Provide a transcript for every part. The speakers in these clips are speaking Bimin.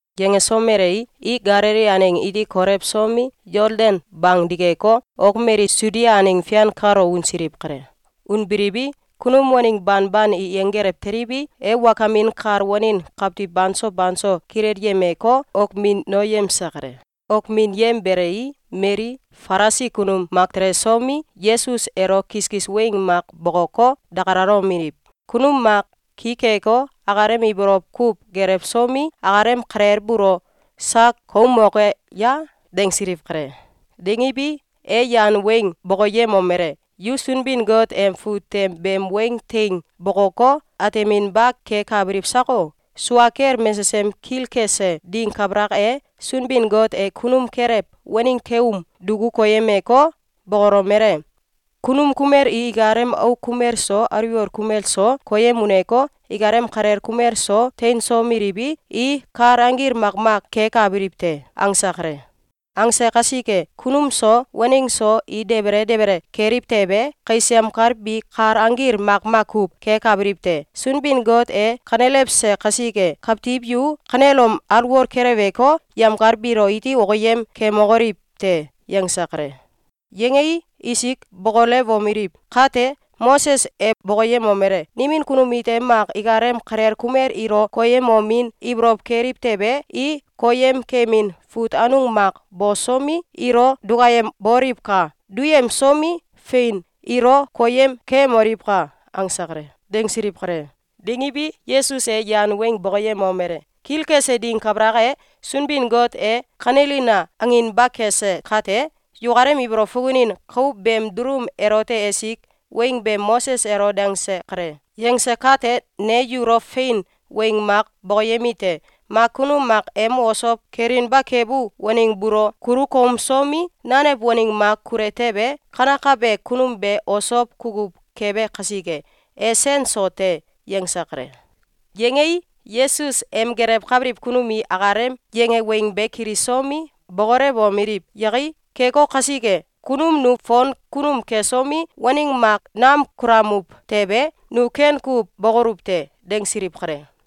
Yangesomelei, i Galili aneng iti kolewsomi, Yoldan bang dikeko, ok mali Sudia aneng fian kalo unsiliw kale. Unbiliwi, kunum waneng banban i yenggelew teliwi, e wakamin kal wanin kawtiw banso banso kilelyemeko, wokminoyemse kale. Wokminyembelei, mali Falisi kunum mak telesomi, Yesus elo kiskis weng mak bokoko, dakalalomeliw: ‘Kunum mak ki keko, akalem ibolow kuw gelewsomi, akalem kalel buulo sak koumoke ye?”, dangsiliw kale. Dangiwi, e yan weng bokoyemomele: “Yu Sunbin-Got em fut tem beem weng teing bokoko, ateminba kekabiliw sako? Sua kel mesesem kilkese ding kabalak e, Sunbin-Got e kunum kelew, waneng keum duku koyemko, bokolomele: ‘Kunum kumel i ikalem auk kumel so aliwol kumel so koyem uneko, ikalem kalel kumel so teinsomeliwi, i kal anggil makmak kekabiliw te.’, angse kale. Angse kasike, kunum so waneng so i debele debele keliw tewe, kais yemkal bi kal anggil makmak kuw kekabiliw te. Sunbin-Got e kanelewse kasike, kawtiw yu kanelom alwol keleweko, yemkal biilo iti okiyem kemokoliw te!”, yangse kale. Yangei, isik bokolewomeliw: “Kate Moses e bokoyemomele: ‘Nimin kunum ite mak ikalem kalel kumel ilo koyemomin ibolow keliw tewe, i koyemkemin fut anung mak bosomi, ilo dukayemboliwka! Duyemsomi, fein, ilo koyem keyemoliwka!’, angse kale.”, dangsiliw kale. Dangiwi, Yesus e yan weng bokoyemomele: “Kilkese ding kabalak e, Sunbin-Got e ‘Kanelina!’ anginba kese kate, yukalem ibolow fukunin kau beem dulum elote esik weng be Moses elo dangse kale. Yangse kate ne yulo fein weng mak bokoyemite: Mak kunum mak em osow kelinba kebu waneng buulo kulu koumsomi, nanew waneng mak kule tewe, kanekabe kunum be osow kukuw kebe kasike, e sen so te.”, yangse kale. Yangei, Yesus em gelewkabiliw kunum i akalem yange weng be kilisomi, bokolewomeliw: “Yakai! Keko kasike, kunum nu fon kunum kesomi, waneng mak nam kulamuw tewe, nu ken kuw bokoluw te!”, dangsiliw kale.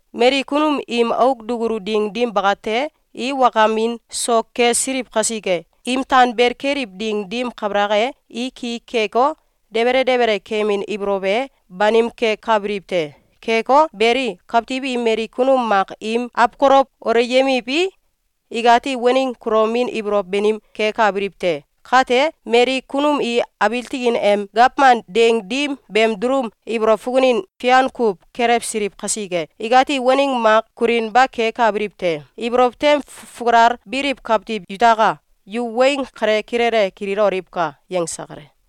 Mali kunum im auk dukulu ding dim bakate, i wakamin so kesiliw kasike, im tanbel keliw ding dim kabalak e, i ki keko, debele debele kemin ibolow e banim kekabiliw te. Keko beli, kawtiw i mali kunum mak im awkolow wolyemiwi, ikati waneng kulomin ibolow banim kekabiliw te. Kate mali kunum i abiil tikin em gawman ding dim beem dulum ibolow fukunin fian kuw kelewsiliw kasike, ikati waneng mak kulinba kekabiliw te. Ibolow tem fukalel biliw kawtiw yutaka! Yu weng kale kilele kililoliwka!”, yangse kale.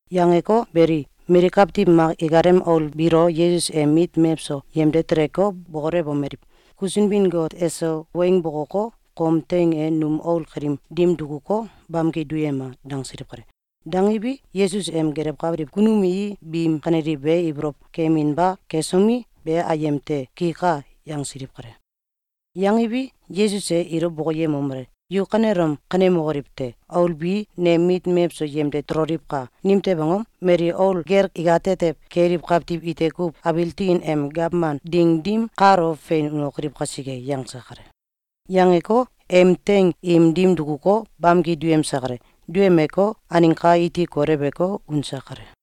Yangeko beli, mali kawtiw mak ikalem aul biilo Yesus em mit mewso yemde teleko, bokolewomeliw: “Ku Sunbin-Got eso weng bokoko, kom teing e num aul kaliim dim dukuko, bamki duyema!” dangsiliw kale. Dangiwi, Yesus em gelewkabiliw kunum i biim kaneliw be ibolow keyeminba kesomi, “Be ayem te! Kika!”, yangsiliw kale. Yangiwi, Yesus e ilo bokoyemomele: “Yu kanelom kanemokoliw te! Aul bi nem mit mewso yemde teloliwka! Nimtew angom? Mali aul gel ikatetew keliw kawtiw ite kuw abiil tikin em gawman ding dim kalo fein unokoliw kasike.”, yangse kale. Yangeko, em teing im dim dukuko, bamki duyemse kale. Duyemeko, aneng ka iti kolewko, unse kale.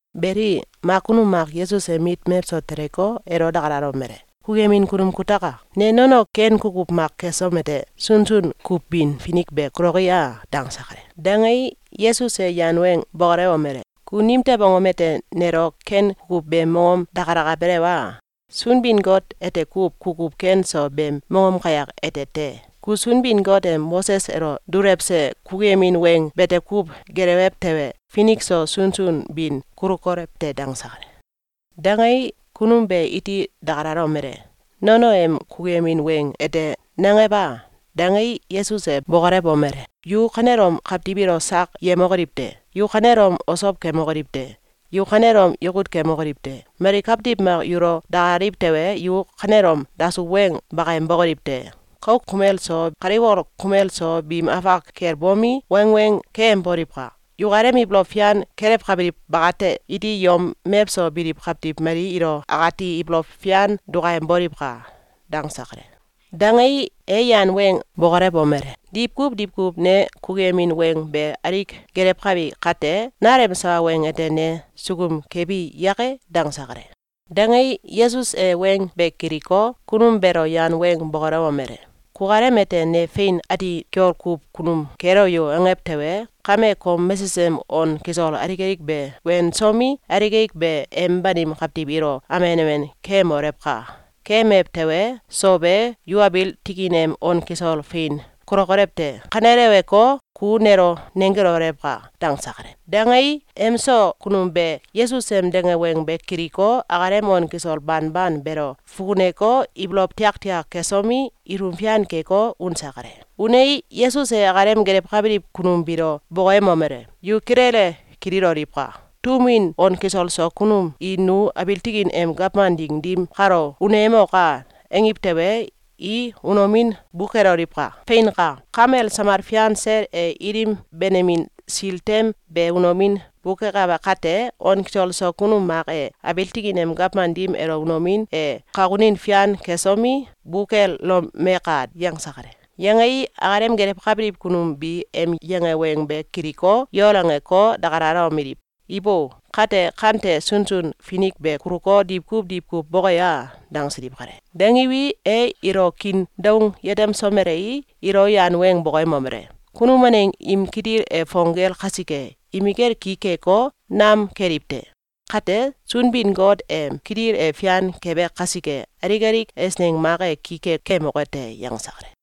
Beli, mak kunum mak Yesus em mit mewso teleko, elo dakalalomele: “Kukuyemin kunum kutaka! Ne nono ken kukuw mak kesom ete, sunsun kuw bin finik be kuloki a?”, dangse kale. Dangei, Yesus e yan weng bokolewomele: “Ku nimtew angom ete nelo ken kukuw beem mongom dakalakabelew a? Sunbin-Got ete kuw kukuw ken so beem mongom kayak ete te! Ku Sunbin-Got em Moses elo dulewse kukuyemin weng bete kuw gelewew tewe, finik so sunsun bin kulukolew te.”, dangse kale. Dangei, kunum be iti dakalalomele: “Nono em kukuyemin weng ete nangew a?”, dangei, Yesus e bokolewomele: “Yu kanelom kawtiw ilo sak yemokoliw te! Yu kanelom osow kemokoliw te! Yu kanelom yakut kemokoliw te! Mali kawtiw mak yulo dakalaliw tewe, yu kanelom dasuw weng bakayem bokoliw te! Kauk kumel so kaliwol kumel so biim afak kel bomi, wangweng keyemboliwka! Yukalem ibolow fian kelewkabiliw bakate iti yom mewso biliw kawtiw mali ilo akati ibolow fian dukayemboliwka!”, dangse kale. Dangei, e yan weng bokolewomele: “Diwkuw diwkuw ne kukuyemin weng be alik gelewkabi kate, nalem sawa weng ete ne sukum kebi yake?”, dangse kale. Dangei, Yesus e weng be kiliko, kunum beelo yan weng bokolewomele: “Kukalem ete ‘Ne fein ati kiol kuw kunum kelo yo!’, angew tewe, kame kom mesesem on kisol alik be wensomi, alik alik be em banim kawtiw ilo amen amen keyemolewka! Keyemew tewe, sow e, yu abiil tikin em on kisol fein kulokolew te. Kaneleweko, ku nelo nenggelolewka!”, dangse kale. Dangei, em so kunum be Yesus em dange weng be kiliko, akalem on kisol banban beelo fukuneko, ibolow tiaktiak kesomi, ilum fian keko, unse kale. Unei, Yesus e akalem gelewkabiliw kunum biilo bokoyemomele: “Yu kilele kililoliwka! Tum win on kisol so kunum i ‘Nu abiil tikin em gawman ding dim kalo uneyemoka!’, angiw tewe, i unomin bukeloliwka! Feinka! Kamel samal fian sel e ilim benemin sil tem be unomin bukekabe kate, on kisol so kunum mak e abiil tikin em gawman dim elo unomin e kakunin fian kesomi, bukelomeka!”, yangse kale. Yangei, akalem gelewkabiliw kunum bi em yange weng be kiliko, yol angeko, dakalalomeliw: “Ibo! Kate kante sunsun finik be kuluko, diwkuw diwkuw boke a?”, dangsiliw kale. Dangiwi, e ilo kiin doung yetemsomelei, ilo yan weng bokoyemomele: “Kunum waneng im kitil e fong gel kasike, imikel ki keko, nam keliw te. Kate, Sunbin-Got em kitil e fian kebe kasike, alik alik eisneng mak e ki ke kemoke te.”, yangse kale.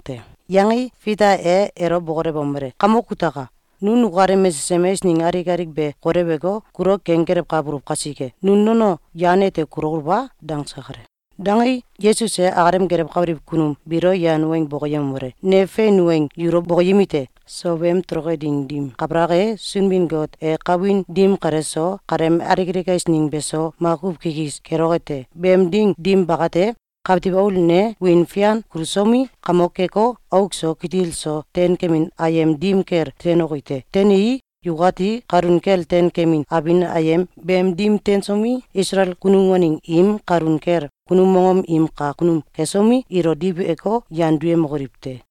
Yangei, Fita e elo bokolewomele: “Kamok kutaka! Nu nukalem mesesem eisneng alik alik be koleweko, kulo kenggelewkabuluw kasike, nu nono yan ete kulokoluw a?”, dangse kale. Dangei, Yesus e akalem gelewkabiliw kunum biilo yan weng bokoyemomele: “Ne fein weng yulo bokoyemi te! Sow em toloke ding dim kabalak e, Sunbin-Got e kawin dim kale so, kaleem alik alik eisneng beso, makuw kikis keloke te. Beem ding dim bakate, Kawtiw Aul ne wiin fian kulusomi, kamok keko, auk so kitil so teinkemin ayem dim kel teinoki te. Teinii, yukati kalun kel teinkemin abin ayem beem dim teinsomi, Isalael kunum waneng im kalun kel kunum mongom im kak kunum kesomi, ilo diweko, yan duyemokoliw te.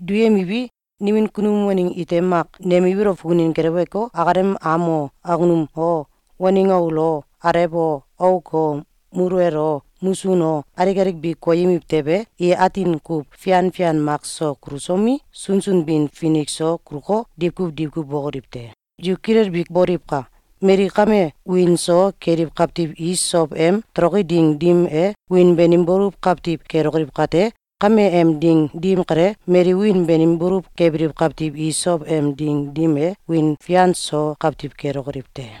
Duyemiwi, nimin kunum waneng ite mak nem ibolow fukunin gelewko, akalem am o, awkunum o, waneng aul o, alew o, auk o, muluwel o, musun o, alik alik bi koyemiw tewe, i atin kuw fian fian mak so kulusomi, sunsun bin finik so kuluko, diwkuw diwkuw bokoliw te. Yu kilelbi boliwka! Mali kame wiin so keliw kawtiw i sow em toloke ding dim e, wiin banim baluw kawtiw kelokoliw kate, kame em ding dim kale, mali wiin banim baluw kebiliw kawtiw i sow em ding dim e, wiin fian so kawtiw kelokoliw te.